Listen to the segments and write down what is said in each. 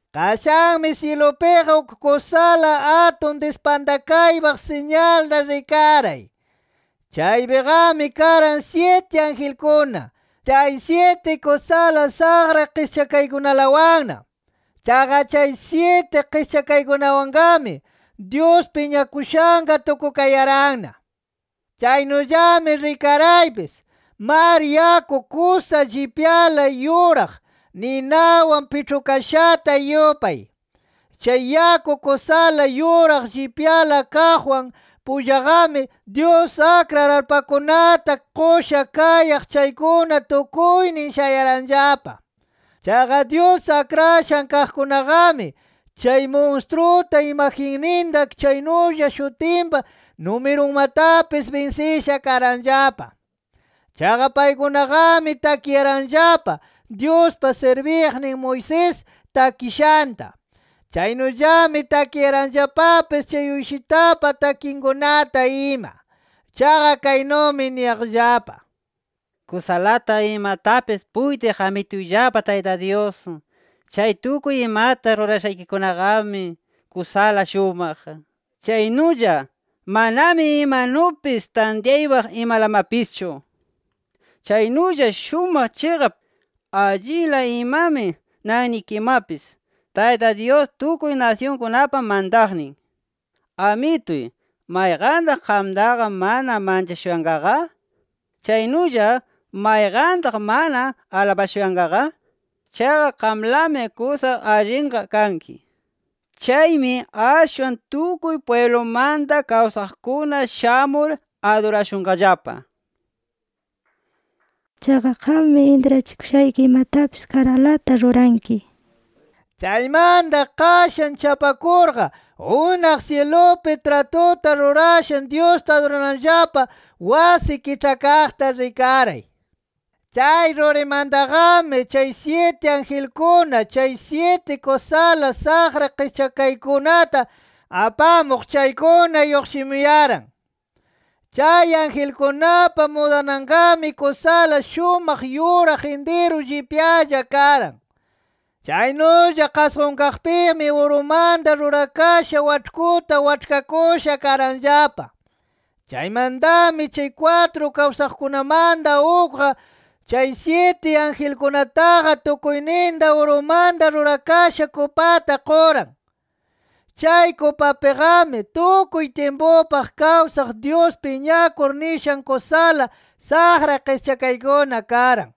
Qashanmi syilupiqa uk kusala atun dispantakaypaq siñalta rikaray. Chaypiqami karan syiti angelkuna, chay syiti kusala saqra qischakaykunalawanna. Chaqa chay syiti qischakaykunawanqami, Dyus piñakushanqa tukukayaranna. Chaynullami rikaraypis, mar yaku kusa llipyala yuraq, ninawan piĉhukashata yupay. Chay yaku kusala yuraq llipyala kaqwan pullaqami, Dyus akrar arpakunata qusha kayaq chaykuna tukuynin shayaranllapa. Chaqa Dyus akrashan kaqkunaqami, chay munstruta, imagenninta chaynulla shutinpa numirunmatapis binsisha karanllapa. Chaqa paykunaqami takiyaranllapa, Dyuspa sirbiqnin Moisés takishanta. Chaynullami takiyaranllapapis chay Uyshitapa takinkunata ima. Chaqa kaynumi niyaqllapa: “Kusalata imatapis puytiq Amituyllapa Tayta Dyus, chay tukuy imata rurashaykikunaqami, kusala shumaq, chaynulla manami imanupis tantyaypaq imalamapischu. Chaynulla shumaq, chiqap, allinla imami nannikimapis Tayta Dyus tukuy nasyunkunapa mantaqnin. ¿Amituy, mayqantaq qamtaqa mana manchashuyanqaqa? Chaynulla ¿mayqantaq mana alabashuyanqaqa? Chaqa qamlami kusa allinqa kanki. Chaymi ashwan tukuy pwiblumanta kawsaqkuna shamur adurashunqallapa. Chaqa, qammi intrachikushayki imatapis karanlata ruranki” nir. Chaymanta, qashan chapakurqa unaq syilupi tratuta rurashan Dyusta adurananllapa wasi kiĉhakaqta rikaray. Chay rurimantaqami, chay syiti angelkuna chay syiti kusala saqra qischakaykunata apamuq chaykuna lluqshimuyaran. Chay angelkunapa mudananqami kusala shumaq yuraq intiru llipyalla karan. Chaynulla qasqunkaqpimi, urumanta rurakasha waĉhkuta waĉhkakusha karanllapa. Chaymantami chay kwatru kawsaqkunamanta ukqa, chay syiti angelkunataqa tukuyninta urumanta rurakasha kupata quran. Chay kupapiqami, tukuy tyimpupaq kawsaq Dyus piñakur nishan kusala saqra qischakaykuna karan.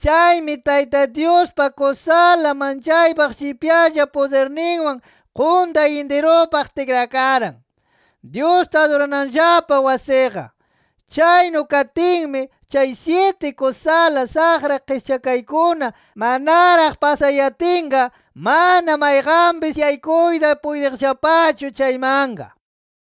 Chaymi Tayta Dyuspa kusala manchaypaq llipyalla pudirninwan quntay intirupaq tikrakaran, Dyusta adurananllapa wasiqa. Chaynu katinmi, chay syiti kusala saqra qischakaykuna manaraq pasayatinqa, mana mayqanpis yaykuyta puytiqllapachu chaymanqa.